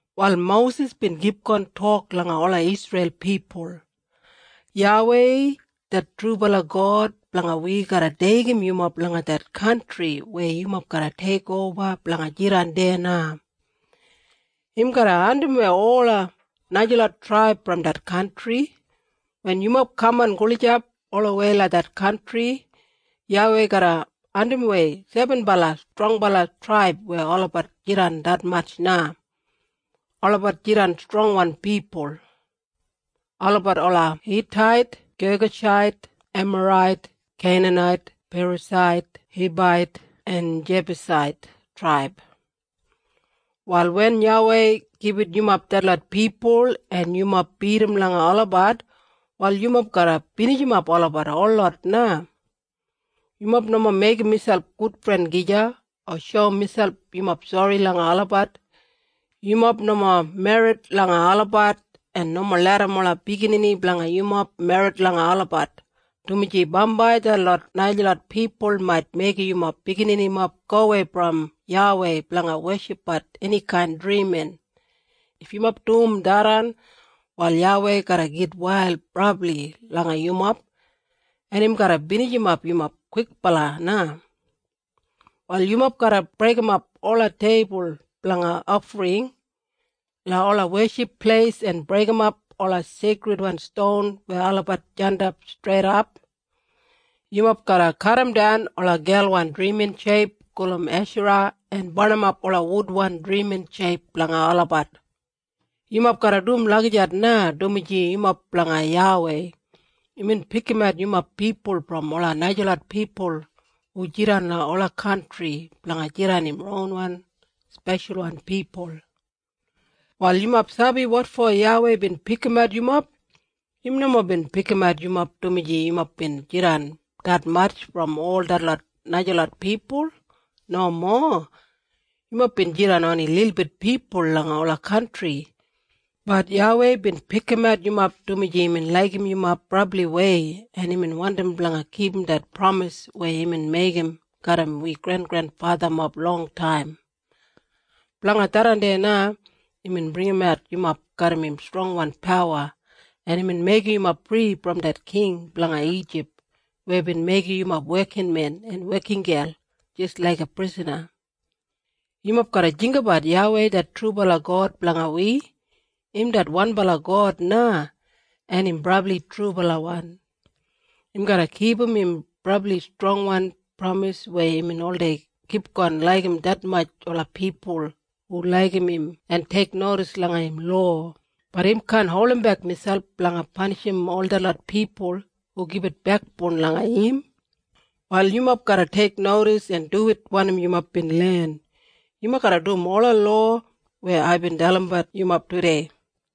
Wal Mosis bin kipgon tok langa ola Isreil pipul, “YAWEI det trubala God blanga wi garra deigim yumob langa det kantri weya yumob garra teikoba blanga jidan deya na. Im garra andimwei ola najalot traib brom det kantri. Wen yumob kaman gulijap olawei langa det kantri YAWEI garra andimwei sebenbala strongbala traib weya olabat jidan detmatj na. Olabat jidan strongwan pipul. Olabat ola Hitait, Gegashait, Emarait, Keinanait, Perasait, Hibait en Jebusait traib. Wal wen YAWEI gibit yumob detlot pipul en yumob bidim langa olabat, wal yumob garra binijimap olabat holot na. Yumob nomo meigim miselp gudfren gija o shoum miselp yumob sori langa olabat. Yumob nomo merrit langa olabat en nomo larram ola biginini blanga yumob merrit langa olabat, dumaji bambai detlot najalot pipul mait meigim yumob bigininimob gowei brom YAWEI blanga weshipbat enikain drimin. If yumob dum tharran, wal YAWEI garra gitwail brabli langa yumob en im garra binijimap yumob kwikbala na. Wal yumob garra breigimap ola teibul blanga ofring langa ola weship pleis en breigimap ola seikridwan ston weya olabat jandap streidap. Yumob garra kadimdan ola gelwan drimin sheip gulum Eshara en barnimap ola wudwan drimin sheip blanga olabat. Yumob garra dum lagijat na, dumaji yumob blanga YAWEI. Imbin pikimat yumob pipul brom ola najalot pipul hu jidan langa ola kantri blanga jidan im ronwan speshalwan pipul. “Wal yumob sabi wotfo YAWEI bin pikimat yumob? Im nomo bin pikimat yumob dumaji yumob bin jidan detmatj brom ol detlot najalot pipul. Nomo. Yumob bin jidan oni lilbit pipul langa ola kantri. Bat YAWEI bin pikimat yumob dumaji imbin laigim yumob brabliwei en imbin wandim blanga kipum det pramis weya imbin meigim garram wi grengrenfathamob longtaim. Blanga tharran na imbin bringimat yumob garram im strongwan pawa en imbin meigim yumob fri brom det king blanga Ijip weya bin meigim yumob wekinmen en wekingel jis laiga prisana. Yumob garra jinggabat YAWEI det trubala God blanga wi. Im det wanbala God na, en im brabli trubalawan. Im garra kipum im brabli strongbala pramis weya im oldei kipgon laigim detmatj ola pipul hu laigim im en teiknodis langa im lowa, bat im kaan holdimbek miselp blanga panishim ol detlot pipul hu gibit bekboun langa im. Wal yumob garra teiknodis en duwit wanim yumob bin len. Yumob garra dum ola lowa weya aibin dalimbat yumob tudei.”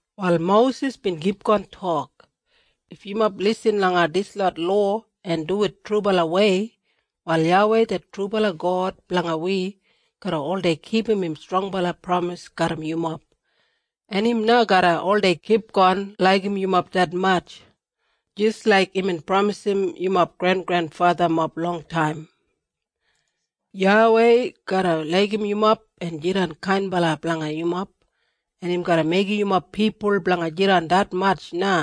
Wal Mosis bin kipgon tok, “If yumob lisin langa dislot lowa en duwit trubalawei, wal YAWEI det trubala God blanga wi garra oldei kipum im strongbala pramis garram yumob. En im na garra oldei kipgon laigim yumob detmatj, jis laik imbin pramisim yumob grengrenfathamob longtaim. YAWEI garra laigim yumob en jidan kainbala blanga yumob en im garra meigim yumob pipul blanga jidan detmatj na.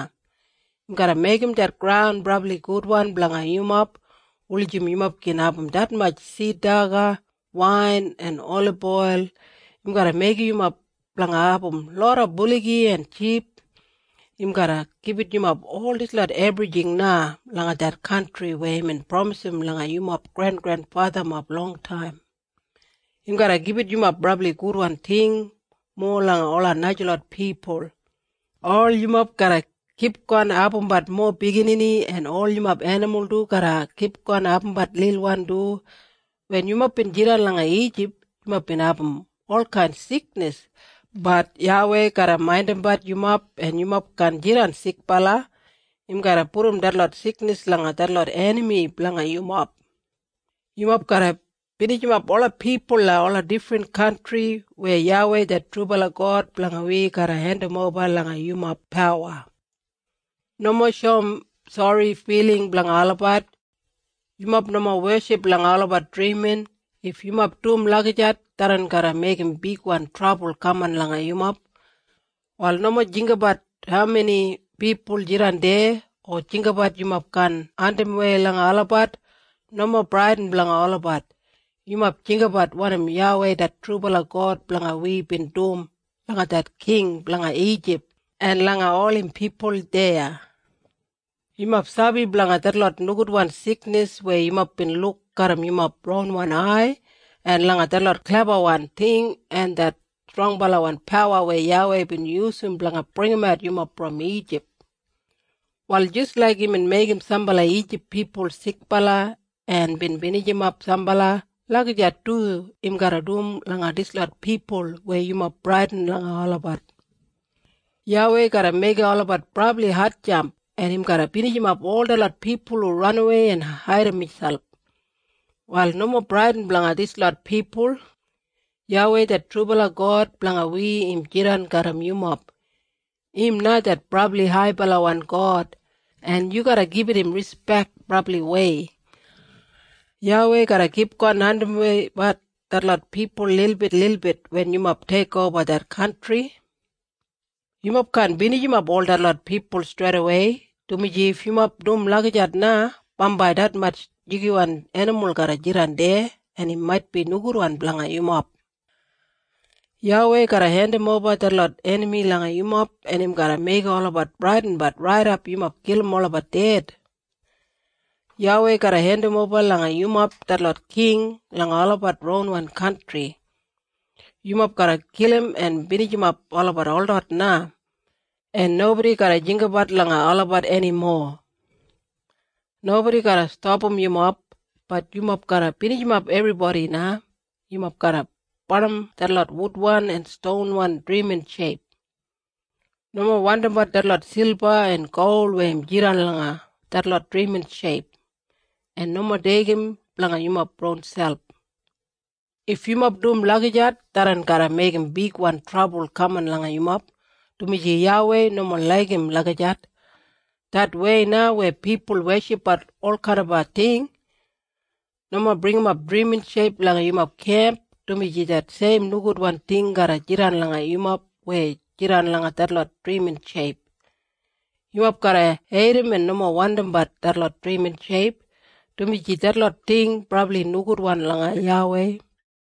Im garra meigim det graun brabli gudwan blanga yumob wulijim yumob gin abum detmatj sid daga, wain en oliboil. Im garra meigim yumob blanga abum loda buligi en ship. Im garra gibit yumob ol dislot ebrijing na langa det kantri weya imbin pramisim langa yumob grengrenfathamob longtaim. Im garra gibit yumob brabli gudwan ting, mowa langa ola najalot pipul. Ol yumob garra kipgon abumbat mowa biginini, en ol yumob enimul du garra kipgon abumbat lilwan du. Wen yumob bin jidan langa Ijip, yumob bin abum olkain siknis. Bat YAWEI garra maindimbat yumob en yumob kaan jidan sikbala. Im garra pudum detlot siknis langa detlot enami blanga yumob. Yumob garra binijimap ola pipul langa ola difrin kantri, weya YAWEI det trubala God blanga wi garra hendimoba langa yumob pawa. Nomo shoum sori filing blanga olabat. Yumob nomo weship langa olabat drimin. If yumob dum lagijat, tharran garra meigim bigwan trabul kaman langa yumob. “Wal nomo jinggabat haumeni pipul jidan deya, o jinggabat yumob kaan andimwei langa olabat. Nomo bradin blanga olabat. Yumob jinggabat wanim YAWEI det trubala God blanga wi bin dum langa det king blanga Ijip en langa ol im pipul deya. Yumob sabi blanga detlot nogudwan siknis weya yumob bin luk garram yumob ronwan ai en langa detlot klebawan ting en det strongbalawan pawa weya YAWEI bin yusum blanga bringimat yumob brom Ijip. Wal jis laik imbin meigim sambala Ijip pipul sikbala en bin binijimap sambala, lagijat du im garra dum langa dislot pipul weya yumob bradin langa olabat. “YAWEI garra meigim olabat brabli hatjamp en im garra binijimap ol detlot pipul hu ranawei en haidim miselp. Wal nomo bradin blanga dislot pipul. YAWEI det trubala God blanga wi im jidan garram yumob. Im na det brabli haibalawan God en yu garra gibit im rispek brabliwei. YAWEI garra kipgon andimweibat detlot pipul lilbitlilbit wen yumob teikoba det kantri. Yumob kaan binijimap ol detlot pipul streidawei, dumaji if yumob dum lagijat na, bambai detmatj jigiwan enimul garra jidan deya en im maitbi nogudwan blanga yumob. “YAWEI garra hendimoba detlot enami langa yumob en im garra meigim olabat bradinbat raidap yumob kilim olabat ded. YAWEI garra hendimoba langa yumob detlot king langa olabat ronwan kantri. Yumob garra kilim en binijimap olabat holot na, en nobodi garra jinggabat langa olabat enimo. Nobodi garra stapam yumob. Bat yumob garra binijimap ebribodi na. Yumob garra barnim detlot wudwan en stonwan drimin sheip. Nomo wandimbat detlot silba en gol weya im jidan langa detlot drimin sheip, en nomo deigim blanga yumob ronselp. If yumob dum lagijat tharran garra meigim bigwan trabul kaman langa yumob, dumaji YAWEI nomo laigim lagijat, det wei na weya pipul weshipbat olkainaba ting. Nomo bringim drimin sheip langa yumob kemp, dumaji det seim nogudwan ting garra jidan langa yumob weya jidan langa detlot drimin sheip. Yumob garra heidim en nomo wandimbat detlot drimin sheip, dumaji detlot ting brabli nogudwan langa YAWEI.”